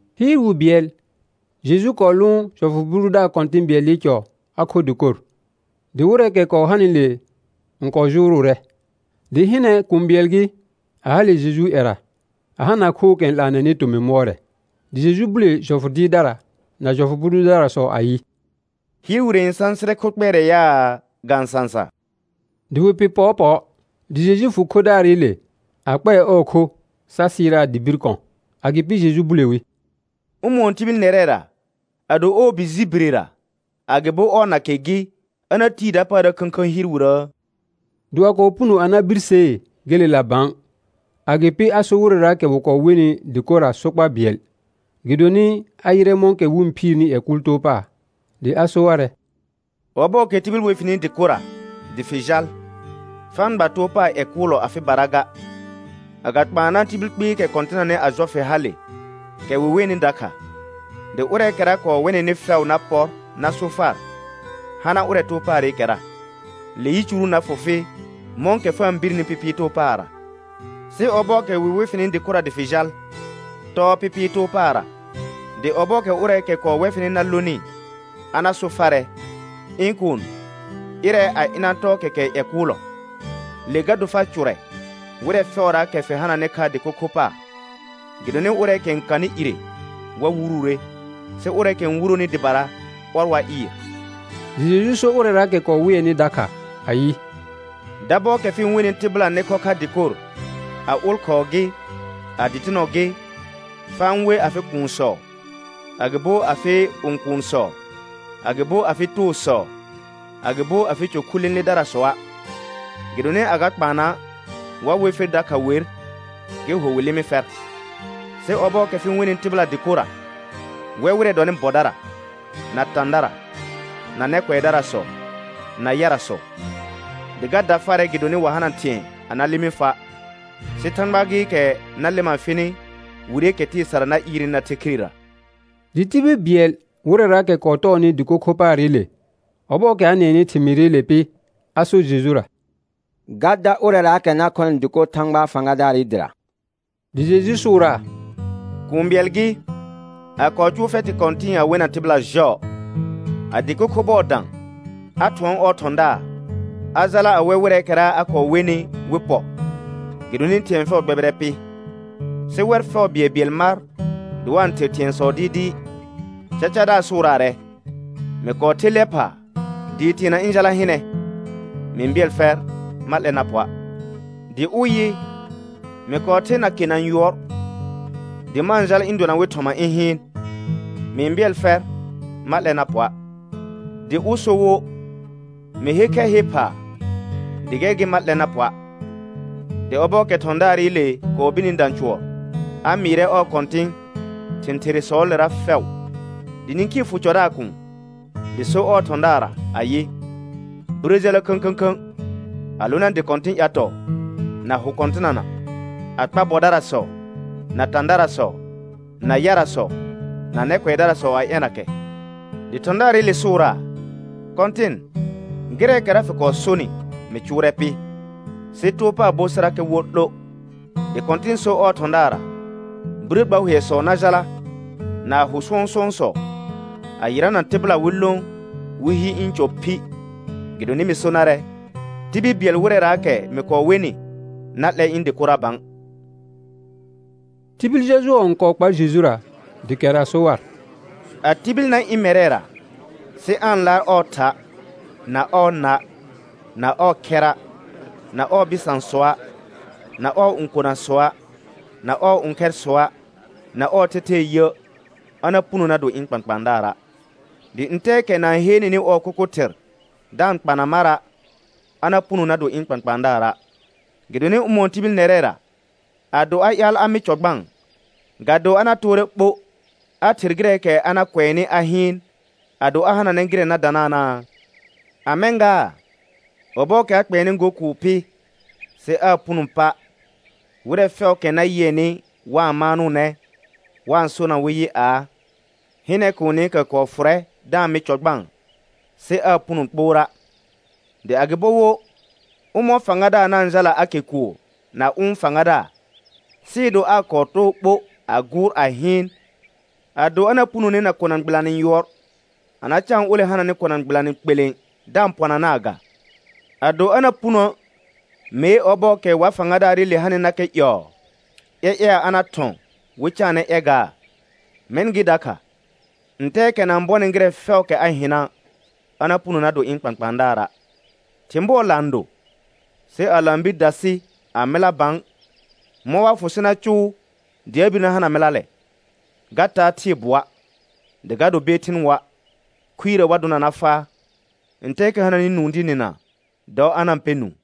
Hɩɩr wi bɩɛl Jeju kɔɔ lʋʋn jɔfʋ bʋ dʋdaar kɔ̃tɩ̃ bɩɛlɩ cɔ a kho dɩkor. Dɩ wɩrɛɛkɛ kɔɔ hanɩle n kɔɔ jʋrʋʋrɛ. Dɩ hɩnɛ, kũu bɩɛl gɩ, a hale Jejuu ƴɛra a hana khookɛ n 'laanɛnɩ tomɩ mʋɔrɛ. Dɩ Jeju bule jɔfʋ dɩɩrdara na jɔfʋ bʋ dʋdarasɔ ayɩ: Hɩɩr wire n sãsɩrɛ kho kpɛɛrɛ yaa, ga-n sãsa? Dɩ wɩ pɩr pɔɔpɔɔ. Dɩ Jeju fʋ khodaarɩle a kpɛɛ ɔɔ kho sa sɩɩraa dɩ bir kɔ̃. Agɩpɩ Jeju bule wi: Ʋmɔ̃ɔ tibil nɛrɛra ado ɔɔ bi ji birera, agɩbo ɔɔ nake gɩ, a na tii dapaara khə̃khə̃ hɩɩr wirəə? Dɩ wa kɔɔ puno a na birsee gelela bã. Agɩpɩ a sor wɩrɛraakɛ wɩ kɔɔ wenɩ dɩkorra sokpa bɩɛl, gɩdonɩ a yɩrɛ mɔ̃kɛ wɩ-n phiirni ƴɛ kʋʋl too pa. Dɩ a so warɛ: Ɔbɔɔkɛ tibil we fɩnɩ dɩkorra dɩ fɩ jal, fa-n gba too paar ƴɛ kʋʋlɔ afɩ dɩbara ga. Agakpaana tibil kpɩɩkɛ kɔ̃tɩnanɩ a jɔ fɩ hale, kɛ wɩ wenɩ dakha; dɩ ʋrɛɛkɛra kɔɔ wɛ nɩnɩ fɛʋ na pɔr na so far: Hana ʋrɛ too paarɩkɛra. Le yicuru na fʋ fɩ mɔ̃kɛ fa-n birni pɩpɩɩ too paarra. Sɩ ɔbɔɔkɛ wɩ we fɩnɩ dɩkorra dɩ fɩ jal, tɔɔ pɩpɩɩ too paarra, dɩ ɔbɔɔkɛ ʋrɛɛkɛ kɔɔ wɛ fɩnɩ na lonɩ a na so farɛ: Ɩ̃ kuun, ɩrɛ a ɩna tɔɔ kɛkɛ ƴɛ kʋʋlɔ. Le ga do far cʋrɛ wɩrɛ fɛʋraakɛ fɩ hananɩ kha dɩko kho paar. Gɩdonɩ ʋrɛɛkɛ n kanɩ ire wa wuruure, sɩ ʋrɛɛkɛ n wuroni dɩbara, ɔr wa ɩɩr. Dɩ Jeju so ʋrɛraakɛ kɔɔ wɩɛnɩ dakha ayɩ: Dabɔɔkɛ fɩ-n wenɩ tɩbɩla nɩ khɔ kha dɩkor, a ʋlkhɔɔ gɩ, a dɩtɩnɔ gɩ, fa-n we afɩ kuunsɔ, agɩbo afɩ õkuunsɔ, agɩbo afɩ toosɔ, agɩbo afɩ cɔ khu lẽledarasɔa'. Gɩdonɩ agakpaana wa we fer dakha wer, gɩ ho wɩ lɩmɩ fɛr. Sɩ ɔbɔɔkɛ fɩ-n wenɩ tɩbɩla dɩkorra, wɛ wɩrɛ dɔnɩ bɔdara, na tãdara, na nɛ kʋɛdarasɔ, na yarasɔ. Dɩ ga da farɛ gɩdonɩ wa hana thɩ̃ɛ a na lɩmɩ fa', sɩ Thãgba gɩɩkɛ na lɩma fɩnɩ wireekɛ tɩɩ sara na ɩɩrnɩ na the khirera. Dɩ tibil bɩɛl wɩrɛraakɛ kɔɔ tɔɔnɩ dɩko kho paarɩle, ɔbɔɔkɛ a nɩɛnɩ thɩmɩɩrɩle pɩ, a sor Jejura: Ga dar ʋrɛraakɛ na khɔnɩ dɩkor Thãgba fãgadaarɩ dɩra. Dɩ Jeju sʋʋraa: Kũu bɩɛl gɩ, a kɔɔ cʋʋ fɛtɩ kɔ̃tɩ̃ɩ a wena tɩbɩla jɔɔ. A dɩko kho bɔɔ dã, a thʋɔn ɔɔ thɔ̃daar a jala a wɛ wɩrɛɛkɛra a kɔɔ wenɩ wɩ pɔ, gɩdonɩ thɩ̃ɛ fɛʋ gbɛbɩrɛ pɩ. Sɩ wɛr fɛʋ bɩɛlbɩɛl mar dɩ wa-n ther thɩ̃ɛsɔ dɩɩdɩɩ: Cacadaar sʋʋraarɛ: Mɩ kɔɔ ther lɛ phaa dɩɩ teena ɩ̃ jala hɩnɛ. Mɩ-n bɩɛl fɛr ma 'lɛ na pɔa'. Dɩ ʋ yɩ: Mɩ kɔɔ ther nakena yʋɔr dɩ ma-n jal ɩ̃ dona wɩ thɔma ɩ̃ hɩɩn. Mɩ-n bɩɛl fɛr ma 'lɛ na pɔa'. Dɩ ʋ so wo: Mɩ her khɛr he phaa, dɩ gɛr gɩ ma 'lɛ na pɔa'. Dɩ ɔbɔɔkɛ thɔ̃daarɩle kɔɔ birni dã cʋɔr, a mɩɩrɛ ɔɔ kɔ̃tɩ̃ thɩ̃ therresɔɔlera fɛʋ. Dɩ nĩkhii fʋ cɔdaar kuun, dɩ so ɔɔ thɔ̃daarra ayɩ: Birə jala khə̃khə̃khə̃ a lona dɩ kɔ̃tɩ̃ ƴatɔɔ na hʋ kɔ̃tɩnana, a kpa bɔdarasɔ, na tãdarasɔ, na yarasɔ, na nɛ kʋɛdarasɔ a ɛna kɛ. Dɩ thɔ̃daarɩle sʋʋraa: Kɔ̃tɩn, gɩrɛɛkɛra fɩ kɔɔ sonɩ mɩ cʋʋrɛ pɩ, sɩ too paar bo sɩrakɛ wo 'lo. Dɩ Kɔ̃tɩn so ɔɔ thɔ̃daarra: Birə gba hʋɛsɔ na jala na hʋ sɔ̃sʋ̃ɔsɔ, a yɩrana tɩbɩla wɩ lõ wɩ hi ɩ̃ cɔ phi. Gɩdonɩ mɩ so narɛ, tibil bɩɛl wɩrɛraakɛ mɩ kɔɔ wenɩ na 'lɛ ɩ̃ dɩkora bã. Tibil jɔjʋɔ n kɔɔ kpar Jejura, dɩ kɛr a so war: A tibil na ɩ̃ mɛrɛra sɩ aa-n laar ɔɔ tha', na ɔɔ na', na ɔɔ khɛra', na ɔɔ bɩsãsɔa', na ɔɔ õkonasɔa', na ɔɔ õkhɛrsɔa', na ɔɔ thɛthɛɛ yə', a na puno na do ɩ̃ kpãkpãadaara'. Dɩ ntɛɛkɛ na-n heenenɩ ɔɔ kʋkʋ thɩr da-n kpana mara', a na puno na do ɩ̃ kpãkpãadaara'. Gɩdonɩ ʋmɔ̃ɔ tibil nɛrɛra ado a ƴaal a mɩ cɔ gbãa, ga do a na toore ɓo a ther gɩrɛɛkɛ a na kʋɛnɩ a hɩɩn, ado a hananɛ gɩrɛ na dananaa? A mɛ̃ gaa, ɔbɔɔkɛ a kpɛɛnɩ go kʋʋ pɩ sɩ aa puno pa', wɩrɛ fɛʋʋkɛ na yɩɛnɩ wa-n maanʋʋnɛ wa-n sonaa wɩ yɩ aa: Hɩnɛ, kuunikɛ kɔɔ fʋrɛ da-n mɩ cɔ gbãa, sɩ aa puno kpoora'. Dɩ agɩbo wo, ʋmɔ̃ɔ fãgadaar na-n jala a ke kʋʋr na ʋ̃ fãgadaar, sɩɩ do aa kɔɔ too ɓo a gʋʋr a hɩɩn, ado a na punone na kona gbɩlanɩ yʋɔr a na caan ole hananɩ kona gbɩlanɩ kpelẽ da-n pɔnanaa ga? Ado a na punoə', mee ɔbɔɔkɛ wa fãgadaarɩle hanɩnakɛ ƴɔɔ, ƴɛƴɛa a na thɔ̃ wɩ caanɛ ƴɛgaa? Mɛ̃ gɩ dakha, ntɛɛkɛ na-n bɔnɩ gɩrɛ fɛʋʋkɛ a hɩna', a na puno na do ɩ̃ kpãkpãadaara'. Thɩ̃ bʋɔ laan do, sɩ a laan bir dasɩ a mɩla bã, mɔ̃ wa fʋ sɩ na cʋʋ dɩ a bir na hana mɩlalɛ? Ga taa thɩɩ bʋɔa', dɩ ga do beethɩn woa'. Khuirə wa dʋna na faa. Ntɛɛkɛ hananɩ nũu dɩ nɩna, dɔ a na-n pɛ nũu.